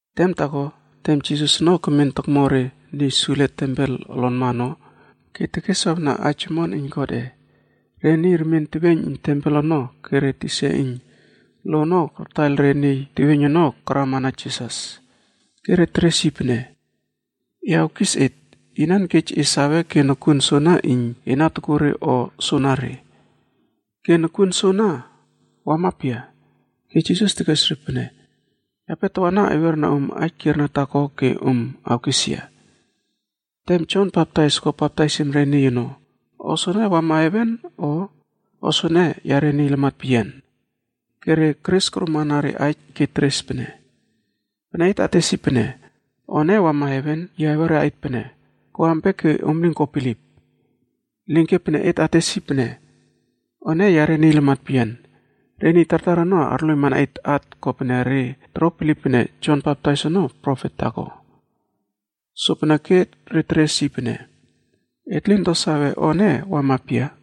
Tem taako, tem Jisas ono kemen tokmo re niy sule tempel olonma ono ke tekeswawna aij omon iyn Godꞌe, re niy remien teweiyn iyn tempel ono ke re tisa iyn lo ono kartaiyl re niy teweiyn ono karama na Jisas. Ke re teres yi pene, “E awkis et, inan kej e sawe ke nokuon soana iyn e na tokuo re o soanare? Ke nokuon soana wama pia?” Ke Jisas tekes re pene, “Yape tawana awiera om aij kierna taako ke om awkes yia. Tem Jon Baptais ko baptaisim re niy ono, o soene wama heven o, o soene yare niy lamat peyian?” Re keres koromana re aij ke teres pene, “Pene et ates pene, ‘O ene wama heven,’ yi awera et pene, ‘Ko ampia ke om lin ko bilip?’ Elinke, pene et ates pene, ‘O ene yare niy lamat peyian,’ re niy tartar ono arloiymana et at kopene re toro bilip pene Jon Baptais ono profet taako.” Sopeneke re teres yi pene, “Et lin to sawe o ene wama pia.”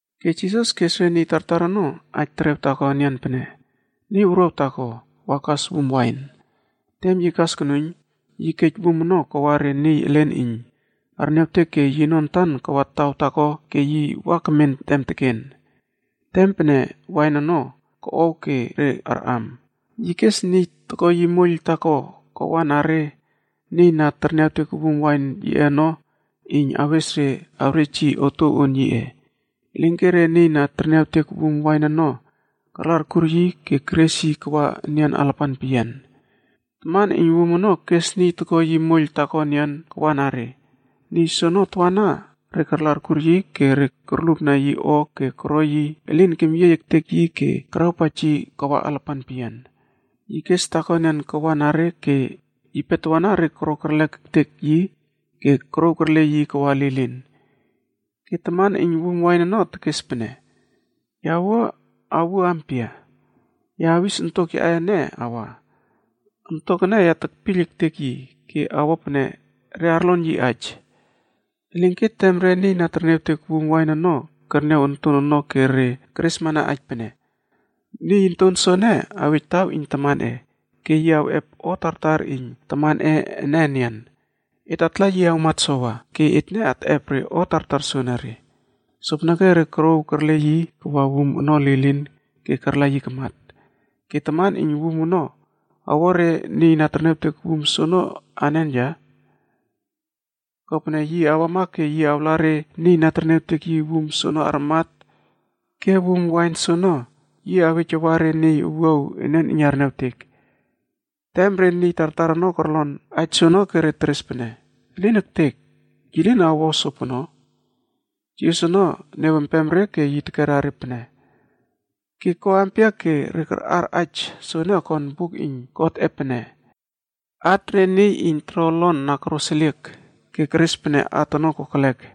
Ke Jisas kes re niy tartar ono aij terew taako enian pene, “Niy wuruaw taako wa kas wum wain. Tem yi kas konuiyn, yi kej wum ono kawa re niy elen iyn arniawtek ke yino antan kawa taw taako ke yi wa kemen tem teken. Tem pene wain ono koꞌow ke re arꞌam, yi kes niy toko yi moiyl taako kawa na re niy na terniawtek wum wain yiꞌe ono iyn awes re awrej yi otuow on yiꞌe. Elinke re niy na terniawtek wum wain ono karla arkur yi ke keres yi kawa enian alapan peyian. Taman iyn wum ono kes niy toko yi moiyl taako enian kawa na re. Niy soono tawana re karla arkur yi ke re korlupna yi o ke koro yi elin kemyiey ektek yi ke karawpaij yi kawa alapan peyian. Yi kes taako enian kawa na re ke yipe tawana re koro kerlek ektek yi ke korouw kerle yi kawa lilin. “Ke taman iyn wum wain ono tekes pene, ‘Ya wua awuo ampia? Ya awis ontok yaꞌe antak ene awa. Ontok ene ya tekpiyl ektek yi ke awo pene re arlon yi aij.’ “Elinke tem re niy na terniawtek wum wain ono kerniaw onton ono ke re keresmana aij pene, ‘Niy onton soene awej taw iyn tamanꞌe ke yi awꞌep o tartar iyn tamanꞌe ene enian. Et atla yi awmat sowa, ke etne atꞌep re o tartar soenere.’ Sopeneke re korouw kerle yi kawa wum ono lilin ke karla yi kamat. “Ke taman iyn wum ono awo re niy na terniawtek wum soono anen ya? Kopene yi awama ke yi awla re niy na terniawtek yi wum soono armat ke wum wain soono yi awej awa re niy owuaw enian iyn arniawtek.” Tem re niy tartar ono korlon aij soono ke re teres pene, “Elin ektek! Yi lin awo o sopono.” Jisas ono niawempem re ke yi tekera re pene, “Ke ko ampia ke re karꞌar aij soene okon buk iyn Godꞌe pene, ‘At re niy iyn toro olon na koroseliek ke keres pene at ono kokelek,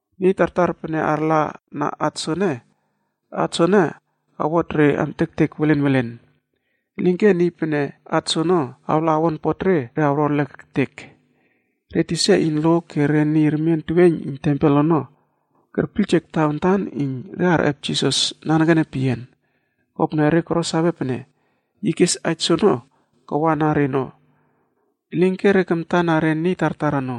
Niy tartar pene arla na at soene, at soene awtot re amtektek welen welen. Elinke niy pene at soono awla awonpot re, re awro erlek ektek.” Re tisa iyn lo ke re niy remien teweiyn iyn tempel ono kerpiyljek tawantan iyn re arꞌep Jisas nanekene peyian, kopene re koro sawe pene yi kes aij terew soono kawa na reno. Elinke re kamta na re niy tartar ono.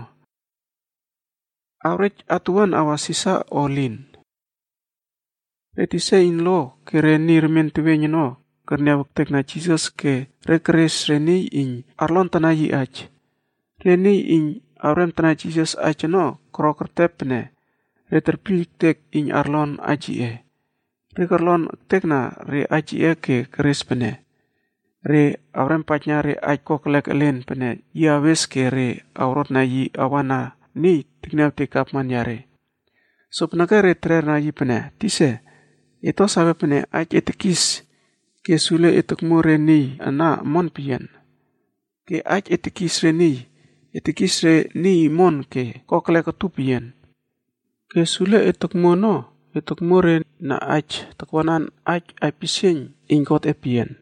Awrej atuwuan awa Sisar o elin? Re tisa iyn lo ke re niy remien teweiyn ono kerniaw ektekna Jisas ke re keres re niy iyn arlontana yi aij. Re niy iyn awremtana Jisas aij ono koro kertep pene re terpiyl ektek iyn arlon aij yiꞌe. Re korlon ektekna re aij yiꞌe ke keres pene re awrempaijna re aij kokelek elen pene yi awes ke re awrotna yi awa na niy tekniawtek gavman yare. Sopeneke re terera yi pene, “Tisa, et to sawe pene aij e tekis ke sule e tokmuo re niy ana omon peyian. Ke aij e tekis re niy, e tekis re niy omon ke kokelek utup peyian. Ke sule e tokmuo ono e tokmuo re na aij takwanan aij aipisieiyn iyn Godꞌe peyian.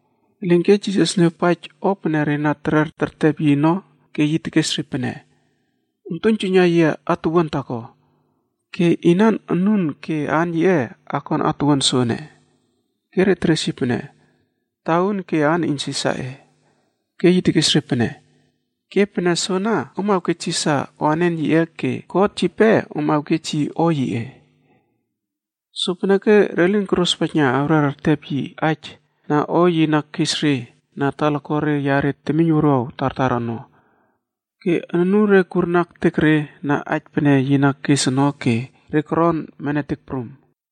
Elinke Jisas niawpaij o pene re na terer tertep yi ono ke yi tekes re pene, “Om aktuiynjuiyna yia atuwuan taako. Ke inan anun ke aan yiꞌe akon atuwuan soene?” Ke re teres yi pene, “Tauun ke aan iyn Sisarꞌe.” Ke yi tekes re pene, “Ke pene soana, om awkej Sisar o anen yiꞌe ke God yipe om awkej yi o yiꞌe.” Sopeneke re lin korospaijna awrer ertep yi aij na o yi na kes re na talakuare yare temiyn wuruaw tartar ono. Ke anure kurna ektek re na aij pene yi na kes ono ke re koron nemetek prum.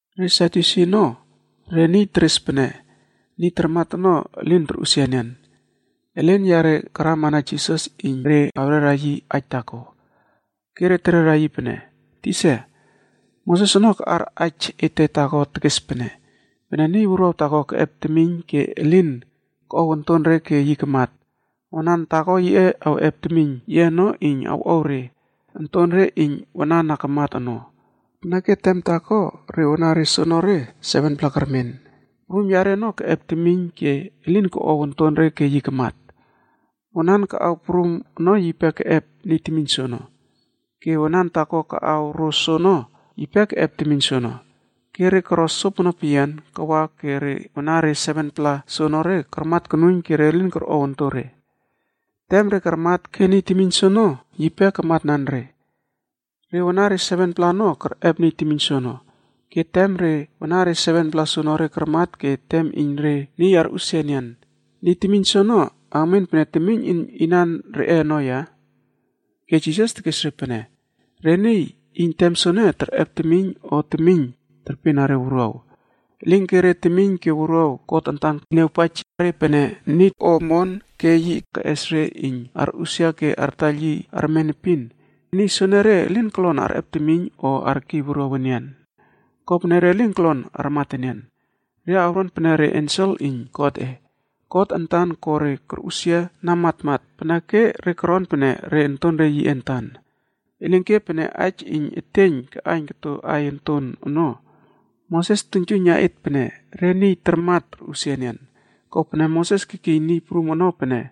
Re Sadyusi ono re niy teres pene niy tarmat ono elin torꞌusia enian. Elen yare karama na Jisas iyn re awrera yi aij taako. Ke re terera yi pene, “Tisa, Moses ono kaꞌar aij ete taako tekes pene, ‘Pene niy wuruaw taako keꞌep temiyn ke elin koꞌow ontonre ke yi awmat, wanan taako yiꞌe awꞌep temiyn yiꞌe ono iyn awꞌow re ontonre iyn wanan na kamat ono.’ Peneke tem taako re wanare soonore 7-pla kermen. Prum yare ono keꞌep temiyn ke elin koꞌow ontonre ke yi kamat. Wanan kaꞌaw prum ono yipe keꞌep niy temiyn soono. Ke wanan taako kaꞌaw ro soono yipe keꞌep temiyn soono, ke re koro sopono peyian kawa ke re wanare 7-pla soonore karmatmat konuiyn ke re lin korꞌow ontore. Tem re karmat ke niy temiyn soono yipe kamatnan re. Re wanare 7-pla ono kerꞌep niy temiyn soono. Ke tem re wanare 7-pla soonore karmat ke tem iyn re niy arꞌusia enian, niy temiyn soono awmen pene temiyn iyn inan reꞌe ono ya?” Ke Jisas tekes re pene, “Re niy iyn tem soene terꞌep temiyn o temiyn terpena re wuruaw. Elinke re temiyn ke wuruaw God antan niawpaij re pene niy omon ke yi keꞌes re iyn arꞌusia ke artaiyl yi armen epin. Niy soenere elin kolon arꞌep temiyn o arkiy wuruaw enian. Kopene re lin kolon armat enian. Re awron pene re ensel iyn Godꞌe. God antan ko re korꞌusia na matmat peneke re koron pene re ontonre yiꞌe antan. Elinke, pene aij iyn eteiyn kaꞌaiyn koto aiy onton ono, Moses tuiynjuiyna et pene re niy tarmat torꞌusia, kopene Moses kekiy Niy Prum ono pene,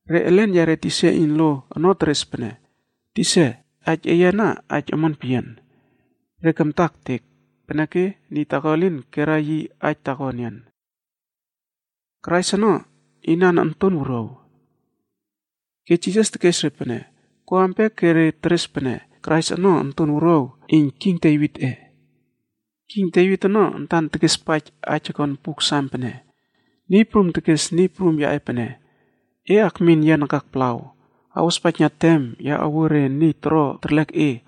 Re elen yare tisa iyn lo ono teres pene, “Tisa, aij eye ana aij omon peyian.” Re kamta ektek, peneke niy taako elin kerna yi aij taako enian. Krais ono inan onton wuruaw? Ke Jisas tekes re pene, “Ko ampia ke re teres pene Krais ono onton wuruaw iyn king Devitꞌec? King Devit ono antan tekespaij aij okon Buk Sam pene: ‘Niy Prum tekes Niy Prum yaꞌe pene, “E akmin yia nakak palaw, awospaijna tem ya awuo re niy toro terlek e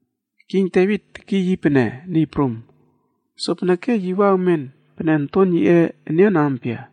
King Devit tekiy yi pene, ‘Niy Prum.’ Sopeneke yi wa awmen pene onton yiꞌe enian ampia?”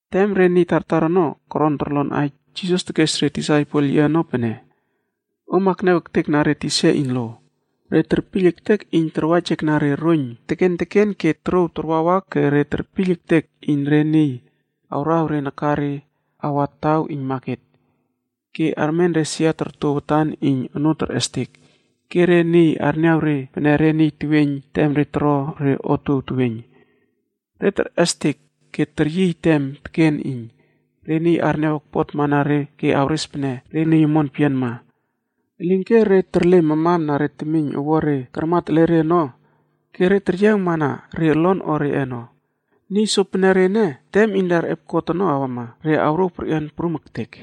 Tem re niy tartar ono koron torlon aij, Jisas tekes re disaipel yiꞌe ono pene, “Om akniaw ektekna re tisa iyn lo. Re terpiyl ektek iyn tarwaijekna re roiyn teken teken ke torouw tarwawa ke re terpiyl ektek iyn re niy awraw re nakare awa taw iyn maket, ke armen re sia torto watan iyn onoo terꞌestek, ke re niy arniaw re pene re niy teweiyn tem re toro re otuow teweiyn. Re terꞌestek ke teryiy tem teken iyn re niy arniaw okpotmana re ke awres pene re niy omon peyianma. Elinke re terle mamamna re temiyn owuare karmat ele re ono ke teryiawmana re olon o reꞌe ono. Niy sopenere ene, tem iyn re arꞌep kot ono awama, re awrouw perꞌian prum ektek.”